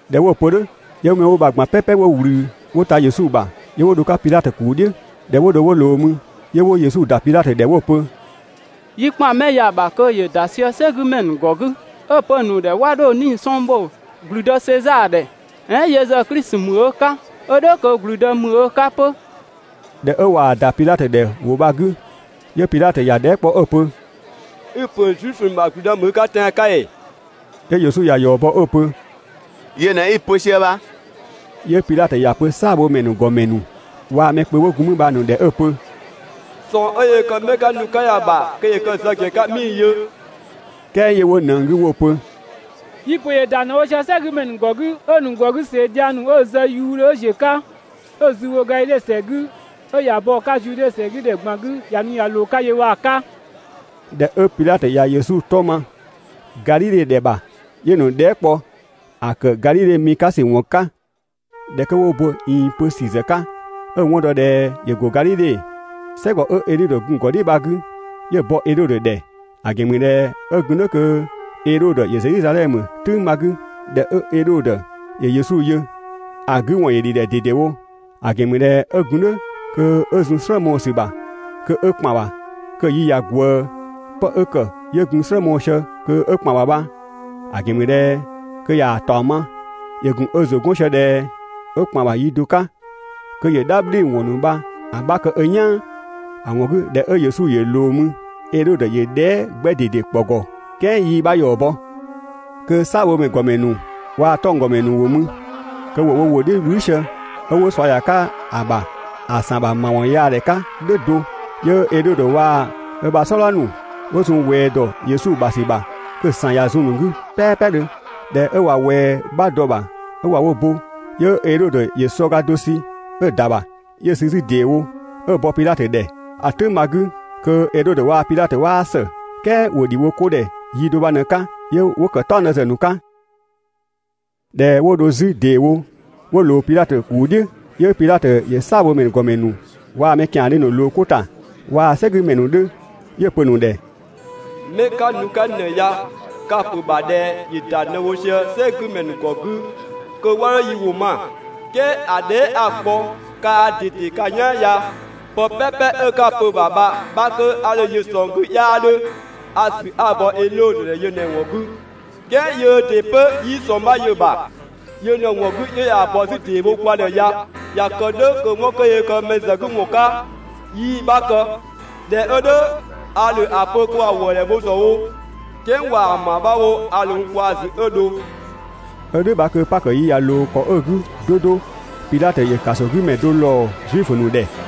꞊Dhɛ 'wo‑ pö "dhʋ̈, 'yö 'mɛ 'wo bha‑ ꞊gban "pɛpɛ 'wo ‑wlü 'wo ‑ta Yesu ‑bha, 'yö 'wo dho‑ 'ka Pidhatö ‑kuu "dhiʋ̈. ꞊Dhɛ 'wo dho 'wo ꞊loo mü, 'yö 'wo Yesu ‑da Pidhatö ‑dhɛ 'wo‑ pö: «Yi ‑kpan 'mɛ ya‑ ‑bha kö ‑yö ‑da sië "sɛgümɛ ‑nu ‑gɔ 'gü, 'ö‑ pö‑ ‑nu ‑dhɛ 'wa 'dho 'nii‑ sɔng bho ‑gblüdë Sezaa ‑dhɛ, "ɛɛn yö ‑zë Klisi ‑mü ö 'ka, ö "dhʋ̈ kö ‑gblüdë ‑mü ö 'ka 'pö.» ꞊Dhɛ 'ö ꞊waa‑ ‑da Pidhatö ‑dhɛ ‑wʋ bha‑ 'gü, 'yö Pidhatö ‑ya dhɛɛ" kpɔ 'ö‑ pö: «I‑ ‑pö Zuifö ‑nu ‑bha ‑gblüdë ‑mü i 'ka tɛan‑ 'ka ‑ee?» 'Yö Yesu ‑ya ‑yɔ bɔ 'ö‑ pö: «Yö ꞊në 'i‑ pö sië bha.» 'Yö Pidhatö ‑ya pö "saabhomɛ ‑nu ‑gɔmɛ ‑nu waa‑ mɛ kpö 'wo gun 'mü bha‑ ‑nu ‑dhɛ 'ö‑ pö: «꞊Sɔng 'ö yöö kë 'mɛ 'ka nu‑ ka ya‑ ‑bha kö ‑yö kë‑ zë ‑gɛn 'ka 'mii‑ yö.» "Kɛɛ 'yö 'wo ꞊nëng 'gü 'wo‑ pö: «Yi‑ ‑pö ‑yö ‑da ꞊në wo sië "sɛgümɛ ‑nu ‑gɔ 'gü, 'ö‑ ‑nu ‑gɔ 'gü ꞊see dhiang ‑nu 'ö‑ zë wuudhö 'ö ‑ziö 'ka, 'ö zü bho Gadhidhe ‑sɛ 'gü 'ö ꞊ya bɔ‑ 'ka Zude ‑sɛ 'gü ‑dhɛ ꞊gban 'gü ꞊ya nu ꞊ya ꞊loo‑ 'ka yö bha‑ 'ka.» ꞊Dhɛ 'ö Pidhatö ꞊ya Yesu 'tɔ ma Gadhidhe ‑dhɛ ‑bha, 'yö‑ ‑nu dhɛɛ" kpɔ‑ ‑kë Gadhidhe mi 'ka ‑sü ‑wɔn 'ka. ꞊Dhɛ 'kö 'wo bo‑ ꞊iin 'pö ‑sü ‑zë 'ka, 'ö‑ 'wɔn dɔ ꞊dhɛ ‑yö ‑go Gadhidhe, "sɛgɔ 'ö Edhodö gun‑ ‑gɔdhiʋ̈ bha‑ 'gü, 'yö‑ bɔ Edhodö ‑dhɛ, ‑a ‑gɛn ‑mü ꞊dhɛ 'ö gun "dhʋ̈ kö Edhodö ‑yö Zedhizadhɛmö "tʋ̈ng bha‑ 'gü. ꞊Dhɛ 'ö Edhodö ‑yö Yesu yö, ‑a 'gü ‑wɔn ‑yö ‑dhi ‑dhɛ ꞊dedewo, ‑a ‑gɛn ‑mü ꞊dhɛ 'ö gun "dhʋ̈ kö 'ö zun‑ "slë mɔɔ‑ ‑sü ‑bha kö 'ö ‑kpan ‑bha kö‑ yi ꞊ya ꞊gwëë. Pë 'ö ‑kë 'yö gun‑ "slë mɔɔ‑ sië kö 'ö‑kpan ‑bha bha, ‑a ‑gɛn ‑mü ꞊dhɛ kö ꞊yaa‑ ‑taɔng ma, 'yö gun ö ‑zʋ 'gɔn sië ꞊dhɛ 'ö ‑kpan ‑bha yi do 'ka kö ‑yö "dhabhliwɔn ‑nu bha‑ 'bha kë ö "yaan. ‑A ‑wɔn 'gü ꞊dhɛ 'ö Yesu ‑yö ꞊loo mü, Edhodö ‑yö dhɛɛ" 'gbɛ ꞊dede ‑kpɔ ‑gɔ "kɛɛ 'yii‑ 'bha ‑yɔ bɔ. Kö "saabhomɛ ‑nu ‑gɔmɛ ‑nu waa‑ 'tɔnggɔmɛ ‑nu ‑wo mü, kö ‑wo wo ‑wʋ "dhiʋ̈ "wlü sië 'ö 'wo ꞊sua ‑ya ‑bha ‑a ‑san ‑bha ‑mawɔnyaadhɛ 'ka "dhʋ̈ do. 'Yö Edhodö waa‑ ö ‑bha "sɔdha ‑nu 'wo zun ꞊wɛɛ ‑dɔ Yesu ‑bha ‑sü ‑bha kö‑ ‑san ꞊ya zun‑ ‑nu 'gü "pɛɛpɛdhö. ꞊Dhɛ 'ö ꞊wa ꞊wɛɛ 'bha dɔ‑ ‑bha 'ö ꞊wa wo bo, 'yö Edhodö ‑yö sɔ ga do sü 'ö‑ ‑da ‑bha, 'yö‑ sü 'zü ‑deewo 'ö‑ bɔ Pidhatö ‑dhɛ. ‑A "tʋ̈ng bha‑ 'gü, kö Edhodö waa‑ Pidhatö 'waa ‑së, "kɛɛ ‑wo ‑dhi wo 'ko ‑dhɛ yi do bha‑ ꞊në‑ 'ka, 'yö 'wo ‑kë "taɔngdë ‑zë ‑nu 'ka. ꞊Dhɛ 'wo dho 'zü ‑deewo 'wo ꞊loo Pidhatö ‑kuu "dhiʋ̈, 'yö Pidhatö ‑yö "saabhomɛ ‑nu ‑gɔmɛ ‑nu waa‑ mɛ ‑kiandhö ‑nu ꞊loo 'ko ‑ta waa‑ "sɛgümɛ ‑nu 'dhö, 'yö‑ pö‑ ‑nu ‑dhɛ: «'Mɛ 'ka nu‑ 'ka n ‑dhɛ ya ka‑ ‑pö ‑bha ꞊dhɛ ‑yö ‑da ꞊në wo sië "sɛgümɛ ‑nu ‑gɔ 'gü kö 'wa 'dho yi ‑wʋ ma, "kɛɛ ‑a dhɛɛ" 'a‑ kpɔ kaa ꞊dede ka "yaan ya, pë "pɛpɛ 'ö 'ka‑ pö‑ ‑bha bha‑ 'bha 'kö 'a dho‑ yö ‑a ꞊sɔng 'gü 'yaa 'dhö. A‑ ‑sü 'a‑ bɔ Edhodö ‑dhɛ yö ꞊në‑ ‑wɔn 'gü, "kɛɛ yöö ‑dɩ 'pö 'yii ꞊sɔng 'bha yö‑ ‑bha. Yö ꞊në‑ ‑wɔn 'gü 'yö ꞊yaa‑ bɔ 'zü ‑deewo kwa ‑dhɛ ya. ꞊Ya kë "dhʋ̈ kö 'wɔn 'kö yöö kë mɛ ‑zë 'gü ‑wɔn 'ka, 'yii‑ 'bha kë. ꞊Dhɛ 'ö "dhʋ̈, a ‑dho ‑a pö kö ‑wa ‑wëëdhɛ bho ‑zë wo, "kɛɛ ꞊waa‑ ‑ma 'bha wo a ‑dho n kwaa‑ ‑zü 'ö dho.» ['Ö "dhʋ̈ bha kö Pakö yi ꞊ya ꞊loo ‑kɔ 'ö‑ 'gü 'do 'do, Pidhatö ‑yö ‑kasogümɛ do ‑lɔɔ Zuifö ‑nu ‑dhɛ.]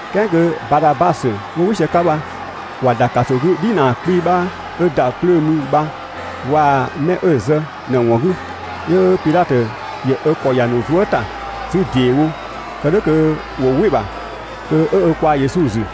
"Kɛɛ kö Badhabasö 'wo "wɩ sië‑ 'ka bha, ‑wa ‑da ‑kaso 'gü "dhinaa 'kpii‑ 'bha 'ö ‑da 'plöö mü bha waa‑ mɛ 'ö‑ zë ꞊në‑ ‑wɔn 'gü. 'Yö Pidhatö ‑yö ö ‑kɔ ‑ya ‑nu zuë" ‑ta 'zü ‑deewo kë "dhʋ̈ kö ‑wo "wɩ‑ ‑bha kö 'ö ö kwaa‑ Yesu ‑zü.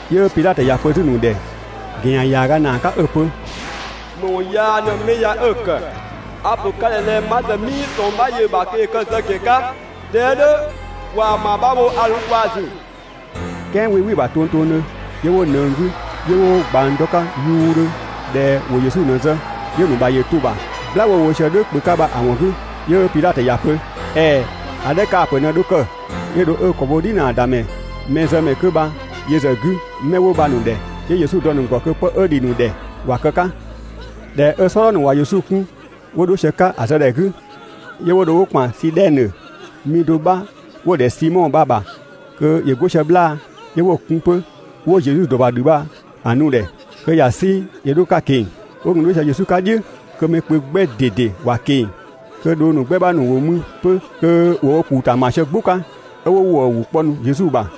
'Yö Pidhatö ‑ya pö 'zü‑ ‑nu ‑dhɛ ‑gɛn ‑yan ‑yaaga ‑naa 'ka 'ö‑ pö: «‑Më ‑wɔn yaa ꞊në 'mɛ ya 'ö‑ ‑kë? A‑ ‑pö ka ‑dhɛ ꞊dhɛ ma ‑zë 'mii ꞊sɔng 'bha yö‑ ‑bha kö ‑yö kë‑ zë ‑gɛn 'ka. ꞊Dhɛ 'ö "dhʋ̈, ꞊waa‑ ‑ma 'bha wo a ‑dho n kwaa‑ ‑zü.» "Kɛɛ 'wii "wɩ‑ ‑bha tongtongdhö, 'yö 'wo ꞊nëng 'gü 'yö 'wo ꞊gbang dɔ‑ 'ka ‑yuudhö ꞊dhɛ ‑wo Yesu ꞊në‑ zë. 'Yö‑ ‑nu ‑bha ‑yö to‑ ‑bha "gbla 'wo‑ wo "dhʋ̈ kpö 'ka bha‑ ‑wɔn 'gü. 'Yö Pidhatö ‑ya pö: «‑Ɛɛ, ‑a 'dhɛ kaa‑ ‑pö ꞊në dho kë.» 'Yö dho 'ö ö ‑kɔ bho "dhinaa ‑damɛ, mɛzëmɛ 'kö bha yö ‑zë 'gü 'mɛ 'wo bha‑ ‑nu ‑dhɛ. 'Yö Yesu dɔ‑ ‑nu ‑gɔ kö 'pë 'ö ‑dhi ‑nu ‑dhɛ ‑wa kë‑ 'ka. ꞊Dhɛ 'ö "sɔdha ‑nu ꞊wa Yesu 'kun 'wo dho sië‑ 'ka ‑a zë ‑dhɛ 'gü, 'yö 'wo dho 'wo ‑kpan Sidhɛnö mi do 'bha 'wo‑ ‑dhɛ Simɔ bha‑ ‑bha kö ‑yö 'go sië 'bhlaa‑, 'yö 'wo‑ kun 'pö 'wo Yesu ‑dɔ bha "dhü bha‑ nu‑ ‑dhɛ kö ‑ya 'sü ‑yö 'dho‑ 'ka‑ ꞊keng‑. 'Wo gun 'dho sië Yesu 'ka "dhiʋ̈ kö mɛ kpö 'gbɛ ꞊dede ‑wa ꞊keng‑, kö dhong ‑nu 'gbɛ 'bha ‑nu ‑wo mü 'pö kö ‑wo wo ‑kuu ‑ta ‑ma sië "gbʋ 'ka, 'ö 'wo ‑wëë ‑wʋ kpɔ Yesu ‑bha.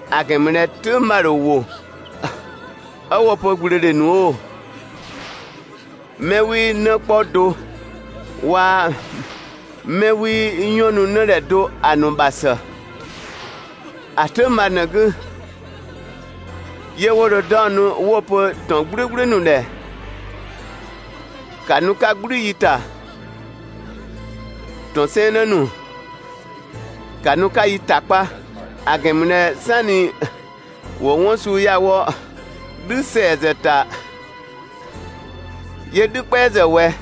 ‑A ‑gɛn ‑mü ꞊dhɛ "tʋ̈ng 'bha‑ ‑dho ‑wo 'ö 'wo‑ pö ꞊gblöödhe ‑nu oo, 'mɛ 'wii 'në 'kpɔ do waa‑ 'mɛ 'wii "yɔn nu 'në ‑dhɛ do ‑a ‑nu ‑bha ‑së! ‑A "tʋ̈ng bha ꞊në‑ 'gü, 'yö 'wo dho 'daɔnnu 'wo‑ pö ‑tɔn "gblʋ̈gblʋ̈ ‑nu ‑dhɛ: «‑Ka nu 'ka ‑gblü yi ‑ta! ‑Tɔn 'sɛɛnnë ‑nu, ‑ka nu 'ka yi ‑ta kpa!» ‑A ‑gɛn ‑mü ꞊dhɛ "sanni ‑wo 'wɔn suu ya‑ wɔ "dhü ‑sɛa ‑zë ‑ta, 'yö "dhü "kpɛa ‑zë ꞊wɛ?»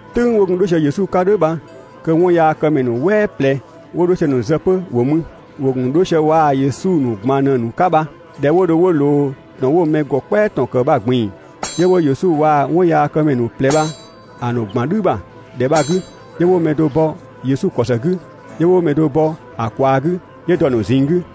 "Tʋ̈ng 'wo gun 'dho sië Yesu 'ka "dhʋ̈ bha kö 'wɔnyaakëmɛ ‑nu "wɛɛ ꞊plɛ 'wo 'dho sië‑ ‑nu zë 'pö ‑wo mü, ‑wo ‑gun 'dho sië waa‑ Yesu ‑nu ꞊gban ꞊në‑ ‑nu 'ka bha. ꞊Dhɛ 'wo dho 'wo ꞊loo ‑tɔn 'wo‑ mɛ ‑gɔ "kpɛa ‑tɔn ‑kë bha‑ ꞊gbin‑, 'yö 'wo Yesu waa‑ 'wɔnyaakëmɛ ‑nu ꞊plɛ bha‑ ‑nu ‑gban "dhü ‑bha ‑dhɛ bha‑ 'gü. 'Yö 'wo‑ mɛ do bɔ Yesu ‑kɔ ‑së 'gü, 'yö 'wo‑ mɛ do bɔ ‑a ꞊kwaa 'gü, 'yö 'wo‑ dɔ‑ ‑nu ꞊zinng 'gü.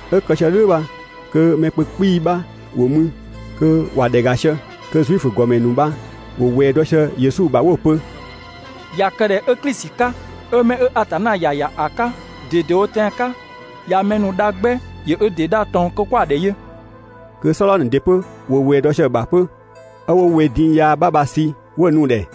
'Ö kë sië "dhʋ̈ bha kö mɛ kpö 'kpii‑ bha ‑wo mü, kö ‑wa ‑dhɛ ‑ga sië. Kö Zuifö ‑nu ‑gɔmɛ ‑nu bha ‑wo ꞊wɛɛ dɔ sië Yesu ‑bha 'wo‑ pö: «꞊Ya kë ꞊dhɛ 'ö Klisi 'ka, 'ö 'mɛ 'ö Atanna ‑ya ‑ya ‑a 'ka ꞊dedewo tɛan‑ 'ka, ꞊ya mɛ ‑nu dha 'gbɛ, ‑yö ö ‑dɩ dha ꞊tɔn kö 'wo‑ ‑dhɛ yö!» Kö "sɔdha ‑nu ‑dɩ 'pö 'wo ꞊wɛɛ dɔ sië‑ ‑bha 'pö, 'ö 'wo we din yaa 'bha bha‑ sü 'wo‑ nu‑ ‑dhɛ.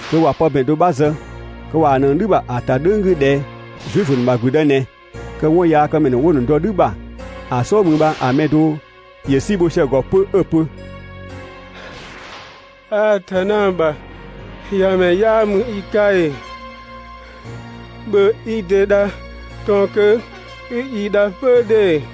Kö ꞊wa pë ‑bɛn do 'bha zë kö ꞊waa‑ ꞊nëng "dhü ‑bha ‑a ‑ta "dhʋ̈ng 'gü ꞊dhɛ: «Zuifö ‑nu ‑bha ‑gblüdë ꞊nɛ». Kö 'wɔnyaakëmɛ ‑nu 'ö 'wo‑ ‑nu ‑dɔ "dhü ‑bha ‑a "sɔɔ mü bha‑ mɛ do ‑yö "si bho sië‑ ‑gɔ 'pö 'ö‑ pö: «Atanna ‑bha ‑Yamɛ 'yaa ‑mü i 'ka ‑ee? ‑Bhö i ‑dɩ dha ꞊tɔn kö 'i yi dha 'pö ‑dhe!»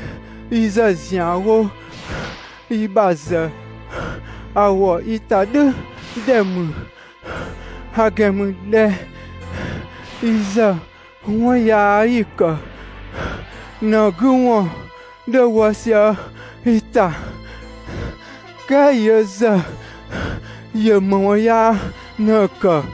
Yi ‑zë ‑zianwo yi ‑bha ‑zë ‑a ‑wɔ yi ‑ta "dhʋ̈ ‑dhɛ ‑mü, ‑a ‑gɛn ‑mü ꞊dhɛ yi ‑zë 'wɔn yaa 'yi‑ ‑kë ꞊në‑ 'gü ‑wɔn 'dhö wɔ sië yi ‑ta, "kɛɛ yö ‑zë ‑yö ‑më ‑wɔn yaa ꞊në‑ ‑kë?»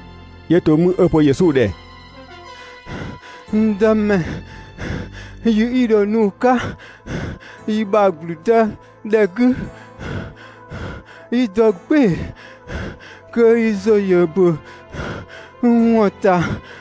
'Yö to 'mü 'ö‑ pö Yesu ‑dhɛ: «N Dëmɛ, yi 'i dho nu‑ 'ka i ‑bha ‑gblüdëdhɛ 'gü, 'i dɔ "gbɩɩ‑ kö i ‑zʋ ‑yö ‑bö n ‑wɔn ‑ta.»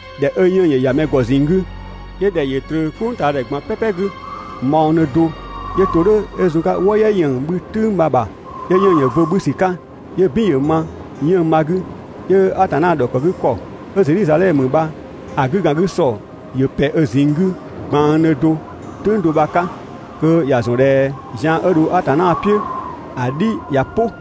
꞊Dhɛ 'ö 'yënng‑ ‑yö ‑ya mɛ ‑gɔ ꞊zinng 'gü, 'yö ‑dhɛ ‑yö ꞊tröö "kpʋngtaadhɛ ꞊gban "pɛpɛ 'gü mɔɔdhö do, 'yö to "dhʋ̈ 'ö zun‑ 'ka "wɔ "yɛ ‑yën 'bhü "tʋ̈ng bha‑ ‑bha. 'Yö 'yënng‑ ‑yö bo 'bhü ‑sü 'ka, 'yö "bin ‑yö ma 'yënng‑ bha‑ 'gü, 'yö Atanna ‑dhɔkëgükɔ 'ö Zedhizadhɛmö bha‑ 'gükangüsɔ ‑yö ‑pɛ ö ꞊zinng 'gü ꞊gbanngdhö do "tʋ̈ng do bha‑ 'ka (kö ‑ya ‑zɔn ꞊dhɛ zian 'ö dho Atanna "piʋ̈ ‑a "dhi ꞊ya "pʋ).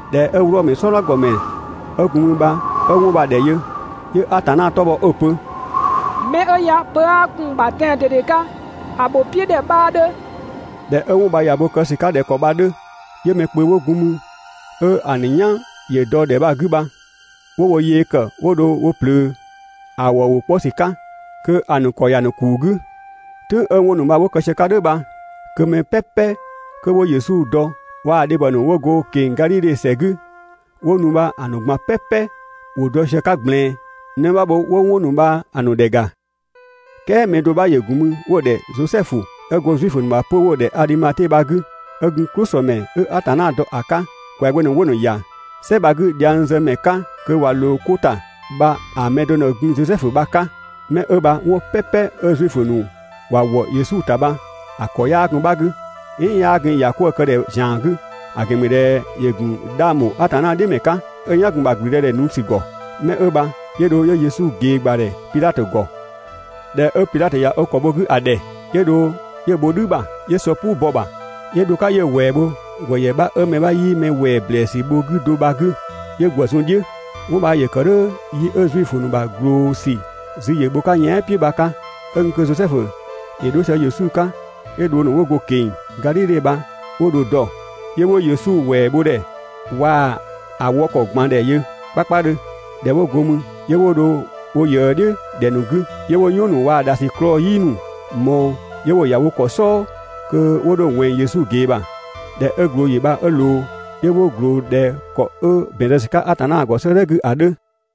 ꞊Dhɛ 'ö Wlɔmö "sɔdha ‑gɔmɛ 'ö gun mü bha 'ö 'wɔn bha‑ ‑dhɛ yö, 'yö Atanna 'tɔ bhɔ 'ö‑ pö: «'Mɛ 'ö ya pö 'aa gun‑ ‑bha tɛan‑ ꞊dede 'ka, ‑a ‑bho "piʋ̈ ‑dhɛ 'bhaa 'dhö!» ꞊Dhɛ 'ö 'wɔn bha ꞊ya bo kë ‑sü 'ka ꞊dhɛ ‑kɔ bha‑ 'dhö, 'yö mɛ kpö 'wo gun mü 'ö‑ ‑nu "yan ‑yö dɔ‑ ‑dhɛ 'gü bha, 'wo wo yee kë 'wo dho wo ꞊plöö ‑a ‑wëë ‑wʋ 'kpɔ ‑sü 'ka kö‑ ‑nu ‑kɔ ‑ya ‑nu ‑kuu 'gü. "Tʋ̈ng 'ö 'wɔn ‑nu bha 'wo kë sië‑ 'ka‑ "dhʋ̈ bha, kö mɛ "pɛpɛ 'kö 'wo Yesu dɔ waa‑ dhebhɔ ‑nu 'wo go‑ ꞊keng‑ Gadhidhe ‑sɛ 'gü 'wo nu bha‑ ‑nu ꞊gban "pɛpɛ ‑wo dɔ sië‑ 'ka ꞊gblɛɛn 'në 'bha wo 'wo 'wɔn ‑nu bha‑ ‑nu ‑dhɛ ‑ga. "Kɛɛ mɛ do 'bha ‑yö ‑gun mü 'wo‑ ‑dhɛ Zosɛfu, 'ö go Zuifö ‑bha 'pö‑ 'wo‑ ‑dhɛ bha‑ 'gü, 'ö gun "klʋsëmɛ 'ö Atanna dɔ ‑a 'ka. ‑Kwɛagbö ‑nu 'wo‑ ‑nu ‑ya "sɛ bha‑ 'gü dhiangzëmɛ 'ka kö ꞊wa ꞊loo 'ko ‑ta bha‑ mɛ do ꞊në gun Zosɛfu bha‑ 'ka. Mɛ 'ö bha 'wɔn "pɛpɛ 'ö Zuifö ‑nu ‑wa ‑wɔ Yesu ‑ta bha‑ ‑kɔ 'yaa gun‑ 'bha 'gü, "ɛɛn 'yaa gun‑ ‑ya 'kwëë‑ kë ‑dhɛ ‑zian 'gü; ‑a ‑gɛn ‑mü ꞊dhɛ ‑yö ‑gun 'dhang ‑bho Atanna "dhiʋ̈ ‑mɛ 'ka, 'ö‑ "yan‑ gun ‑a ‑bha ‑gblüdëdhɛ nu ‑sü ‑gɔ. Mɛ 'ö bha 'yö dho 'yö Yesu ꞊gee ‑gbadhɛ Pidhatö ‑gɔ. ꞊Dhɛ 'ö Pidhatö ꞊ya ö ‑kɔ bho‑ 'gü ‑a ‑dhɛ, 'yö dho 'yö‑ bho "dhü ‑bha, 'yö sɔ "puu bɔ‑ ‑bha, 'yö dho‑ 'ka 'yö‑ ‑wɛɛ bho ‑gwëyɛ 'bha 'ö mɛ 'bha 'yii mɛ ‑wɛɛ ‑blɛɛsü bho‑ bha do bha‑ 'gü. 'Wɔn bha ‑yö ‑kë "dhʋ̈ yi 'ö Zuifö ‑nu ‑bha ꞊gloo ‑sü zü ‑yö bho‑ 'ka yɛan" "piʋ̈ bha‑ 'ka. 'Ö gun kö Zosɛfu ‑yö dho sië Yesu 'ka, 'yö dhong ‑nu 'wo go‑ ꞊keng‑ Gadhidhe bha 'wo dho‑ dɔ, 'yö 'wo Yesu ‑wɛɛbhodhɛ waa‑ ‑a wɔ ‑kɔ ꞊gban ‑dhɛ yö 'kpakpadhö. ꞊Dhɛ 'wo go mü, 'yö 'wo dho wo ꞊yëë "dhiʋ̈ ‑dhɛ ‑nu 'gü, 'yö 'wo "yɔn ‑nu waa‑ ‑dhasiklɔɔ "yi ‑nu ꞊mɔɔ 'yö 'wo‑ ‑ya wo ‑kɔ "sɔɔ kö 'wo dho‑ ꞊wɛnng Yesu ꞊gee ‑bha. ꞊Dhɛ 'ö ꞊glooyi bha 'ö ꞊loo, 'yö 'wo ꞊gloo ꞊dhɛ ‑kɔ 'ö ‑bɛn zë ‑sü 'ka Atanna ‑gɔ 'sëëdhɛ 'gü ‑a 'dhö.